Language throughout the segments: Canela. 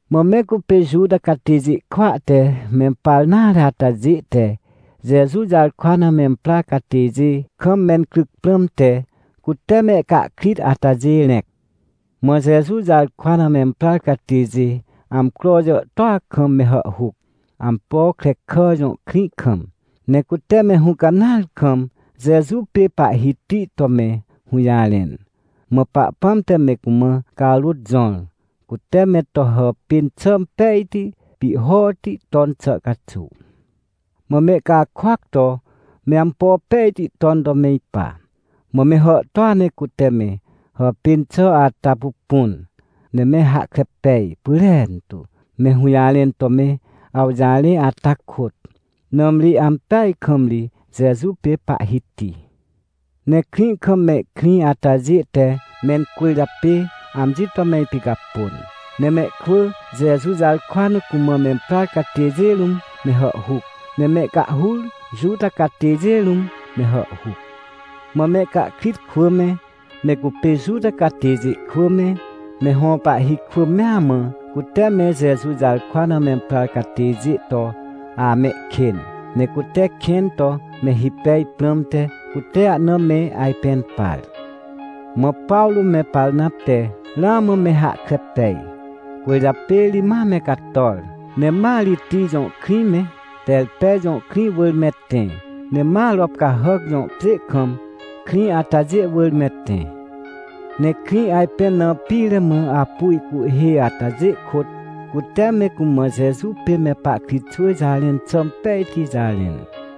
Mã me cupê Juta catêjê kwỳa te mempar nare atajê te Jeju jarkwa na memprar catêjê kam mencryc prãmte, cute mehcahkrit atajê rẽc. Mã Jeju jarkwa na memprar catêjê amcro jàhtôa kam me hàhhuc, Ampokrekà jõ krĩ kam, ne cute me hũcanãar kam Jeju pê Pahhiti to me hũjarẽn. Mã Pahpãm te me cumã carôt jõr, cute me to hàpên xà pejti pihhoti ton xà caxuw. Mã mehcakôac to me ampo pejti ton to me ipa. Mã me hàhtôa ne cute me hàpên xà ata pupun, ne me hahkre pej pyrentu, me hũjarẽn to me awjarẽ ata kôt, nãmri ampeaj kam ri Jeju pê Pahhiti. Ne krĩ kam mehkrĩ atajê te mencwỳrjapê amji to me ipicapôn. Ne mehkwỳ Jeju jarkwa na cumã memprar catêjê rũm me hàhhuc, ne mehcahhur Juta catêjê rũm me hàhhuc. Mã mehcahkrit kwỳ me, me cupê Juta catêjê kwỳ me, me hõ pahhi kwỳ mea mã, cute me Jeju jarkwa na memprar catêjê to amehkên, ne cute kẽn to me hipej prãmte, cute ahna me ajpẽn par. Mã Pawrô me Parnap te ramã me hahkre pej, cwỳrjapê ri ma me cator, ne ma Ritij jõ krĩ me, Terpe jõ krĩ wỳr me tẽ. Ne ma Ropcahàc jõ pjê kam, krĩ atajê wỳr me tẽ. Ne krĩ ajpẽn na pire mã apu ihcuhhê atajê kôt cute me cumã Jeju pê me pahkritxwỳ jarẽn xà impejti jarẽn.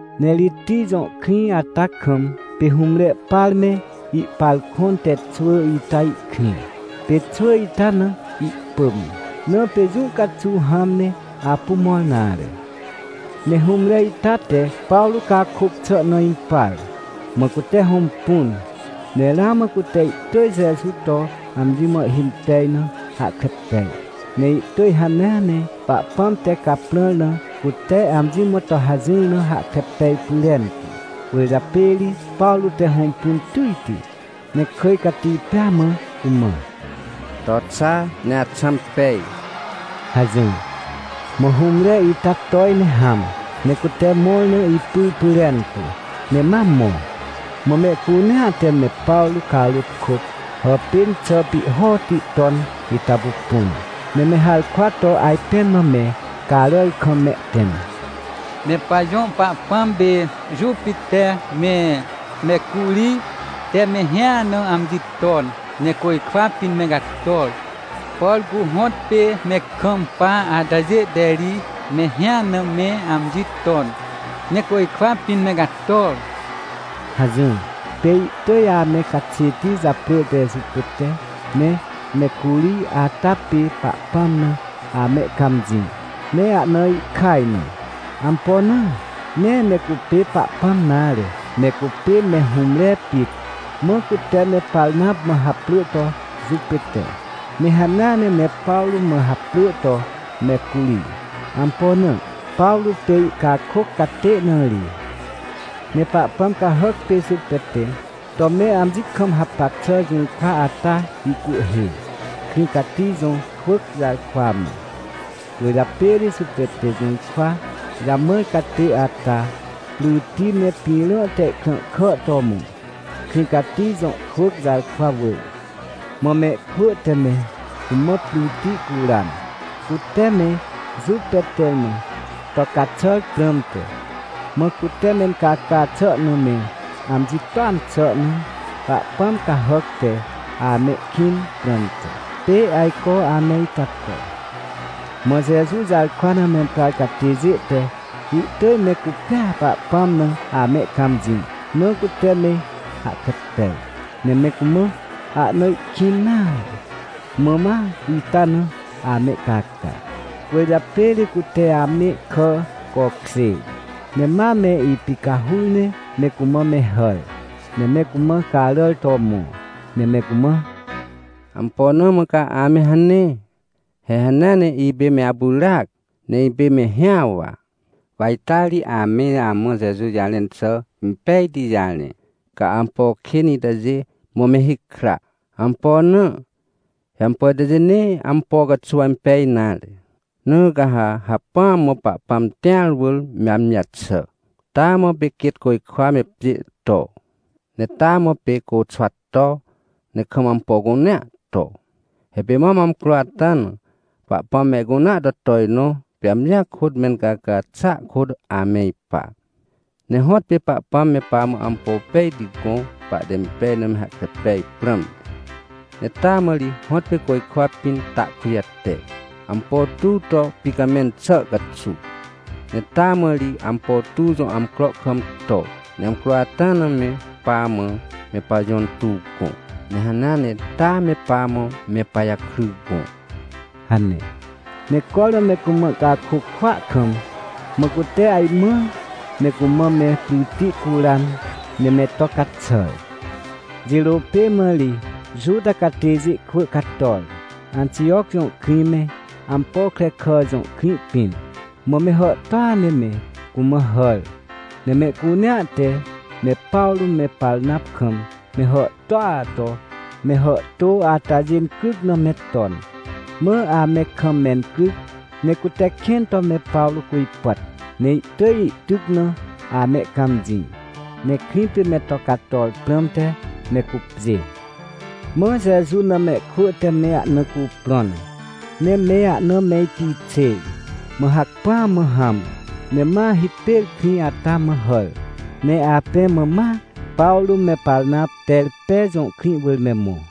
Ne Ritij jõ krĩ ata kam, pê hũmre par me ihpar kõn te xwỳ ita ihkrĩ. Pê xwỳ ita na ihpỳm, na pê jũ caxuw hãm ne apu mõr nare. Ne hũmre ita te Pawrô cakôc xà na impar, mã cute hõmpun, ne ramã cute ihtỳj Jeju to amji mã ihhimpej na hahkre pej, ne ihtỳj hanea ne Pahpãm te caprãr na cute amji mã to hajỹr na hahkre pej pyrentu. Cwỳrjapê ri Pawrô te hõmpun tỳjti, ne kỳj cati pêa mã cumã: — To xa! Ne axãm pej! — hajỹr. Mã hũmre ita toj ne hãm, ne cute mõr na ipyr pyrentu, ne ma mõ. Mã mehcunea te me Pawrô carôt kôt hàpên xà pihhoti ton ita pupun, ne me harkwa to ajpẽn mã me caràr kam mehtẽm: — Me pajõ pahpãm pê Jupiter me Mecurij te mehĩa na amji ton, ne côjkwa pĩn me cator! Por cu hõtpê me kampa atajê te ri mehĩa na me amji ton, ne côjkwa pĩn me cator! — hajỹr. Pê ihtỳj ame caxêti japrỳ te Jupiter me Mecurij ata pê Pahpãm na amehcãmjĩ ne ahna ihkaj na. Ampo na? Nee me cupê Pahpãm nare, me cupê me hũmre pit. Mã cute me Parnap mã haprỳ to Jupiter, ne hanea ne me Pawrô mã haprỳ to Mecurij. Ampo na? Pawrô pê ihcakôc catê na ri. Ne pahpãm cahàc pê Jupiter to me amji kam hapac xà jũrkwa ata ihcuhhê, krĩ cati jõ kwỳc jarkwa mã. Cwỳrjapê ri Jupiter jũrkwa jamãr catê ata, pryti me pĩrã te ihkrãhkà to mõ, krĩ cati jõ kwỳc jarkwa wỳr. Mã mehkwỳ te me cumã pryti curan, cute me Jupiter mã to caxàr prãmte. Mã cute mencaca xà na me amji toan xà na pahpãm cahàc te amehkĩn prãmte, pê ajco ame ita to. Mã Jeju jarkwa na memprar catêjê te ihtỳj me cupêa Pahpãm na amehcãmjĩ na cute me hahkre pej, ne me cumã ahna ihkĩn nare, mã ma ita na amehcaca. Cwỳrjapê ri cute amehkà cokjêr, ne ma me ipicahur ne me cumã me hàr, ne me cumã caràr to mõ, ne me cumã: — Ampo na mã ca ame hane? He hanea ne ipê me apyràac, ne ipê mehĩa wa. Wa ita ri ame amã Jeju jarẽn xà impejti jarẽ. Ca ampo kên itajê mã me hikra. Ampo na? He ampo itajê nee ampo caxuw impej nare. Na ca ha hacpỹa mã Pahpãm tĩar wỳr me amji jaxà. Taa mã pê quêt côjkwa me pjê to. Ne taa mã pê côxwa to, ne kam ampo cunea to. He pê mam amcro ata na, Pahpãm mehcunea to tojnõ, pê amjia kôt, mencaca xàa kôt ame ipa. Ne hõtpê Pahpãm me pamã ampo pejti gõ, pahte impej na me hahkre pej prãmte. Ne taa mã ri hõtpê côjkwa pĩn ta kujate, ampo tuw to ipicamẽn xà caxuw. Ne taa mã ri ampo tuw jõ amcro kam to, ne amcro ata na me pamã me pajõ intuw gõ, ne hanea ne taa me pamã me pajakry gõ — hane. Ne cormã me cumã ihcakôc kwỳa kam, mã cute ajmãr me cumã me pryti curan ne me to caxàr. Jirô pê mã ri Juta catêjê kwỳ cator, Antijoc jõ krĩ me, Ampokrekà jõ krĩ pĩn. Mã me hàhtôa ne me cumã hàr, ne mehcunea te me Pawrô me Parnap kam me hàhtôa to me hàhtô atajê incryc na me ton. Mã ame kam mencryc ne cute kẽn to me Pawrô cujpàt, ne ihtỳj ihtyc na amehcãmjĩ, ne krĩ pê me to cator prãmte me cupjê. Mã Jeju na mehkwỳ te me ahna cuprõn, ne me ahna me ipixêr, mã hacpỹa mã hãm ne ma hipêr krĩ ata mã hàr. Ne apẽ mã ma Pawrô me Parnap, Terpe jõ krĩ wỳr me mõ.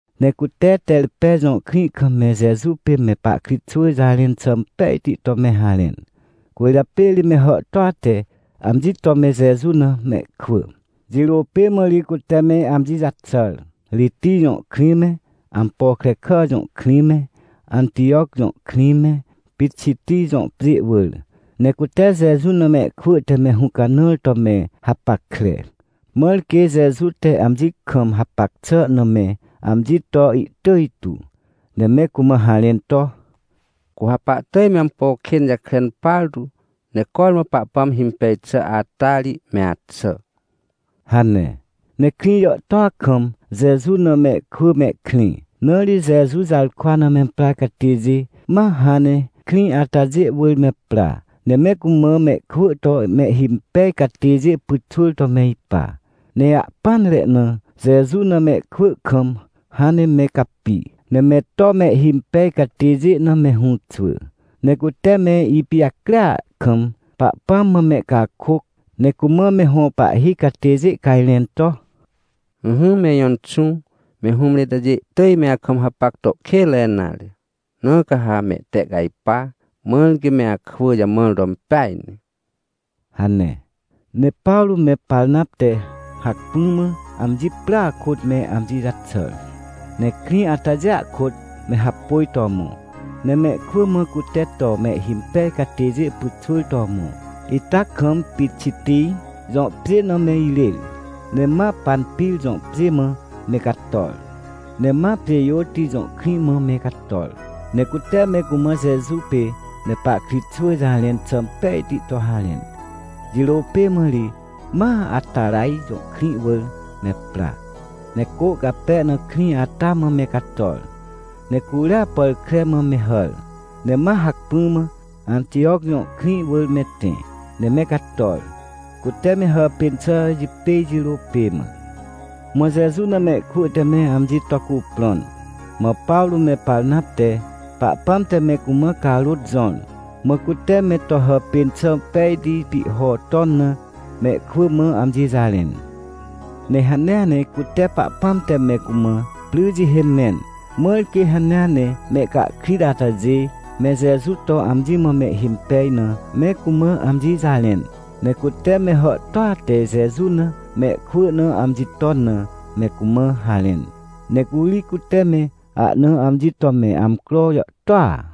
Ne cute Terpe jõ krĩ kam me Jeju pê me pahkritxwỳ jarẽn xà impejti to me harẽn, cwỳrjapê ri me hàhtôa te amji to me Jeju na mehkwỳ. Jirô pê mã ri cute me amji jaxàr, Ritij jõ krĩ me, Ampokrekà jõ krĩ me, Antijoc jõ krĩ me, Pixitij jõ pjê wỳr. Ne cute Jeju na mehkwỳ te me hũcanãr to me hapackre, mãr quê Jeju te amji kam hapac xà na me amji to ihtỳj tu, ne me cumã harẽn to: — Cu ha pahtỳj me ampo kên jakren partu, ne cormã Pahpãm himpej xà ata ri me axà — hane. Ne krĩ jàhtôa kam Jeju na mehkwỳ mehkrĩ. Na ri Jeju jarkwa na memprar catêjê ma hãn ne krĩ atajê wỳr me pra, ne me cumã mehkwỳ to mehhimpej catêjê pyxwỳr to me ipa. Ne ahpỹanre na Jeju na mehkwỳ kam hãn ne me capi, ne me to mehhimpej catêjê na me hũxwỳ. Ne cute me ipijacria kam Pahpãm mã mehcakôc ne cumã me hõ pahhi catêjê cajrẽn to: — Ỹhỹ me ijõ Inxũ, me hũmre itajê ihtỳj me akam hapac to kênre nare, na ca ha mehtehcajpa, mãr quê me akwỳ jamãr to impeaj ne — hane. Ne Pawrô me Parnap te hacpỹ mã amji prya kôt me amji jaxàr, ne krĩ atajêa kôt me hapôj to mõ, ne mehkwỳ mã cute to mehhimpej catêjê pyxwỳr to mõ ita kam Pixitij jõ pjê na me irêr, ne ma Panpir jõ pjê mã me cator. Ne ma Pjêjôti jõ krĩ mã me cator, ne cute me cumã Jeju pê me pahkritxwỳ jarẽn xà impejti to harẽn. Jirô pê mã ri ma Ataraj jõ krĩ wỳr me pra, ne cô cape na krĩ ata mã me cator. Ne curia pàr kre mã me hàr, ne ma hacpỹ mã Antijoc jõ krĩ wỳr me tẽ, ne me cator, cute me hàpên xà jipêj jirô pê mã. Mã Jeju na mehkwỳ te me amji to cuprõn. Mã Pawrô me Parnap te, Pahpãm te me cumã carôt jõr, mã cute me to hàpên xà pejti pihho ton na, mehkwỳ mã amji jarẽn. Ne hanea ne cute Pahpãm te me cumã pry jihê mẽn, mãr quê hanea ne mehcahkrit atajê me Jeju to amji mã mehhimpej na, me cumã amji jarẽn. Ne cute me hàhtôa te Jeju na mehkwỳ na amji ton na me cumã harẽn. Ne curi cute me ahna amji to me amcro jàhtôa.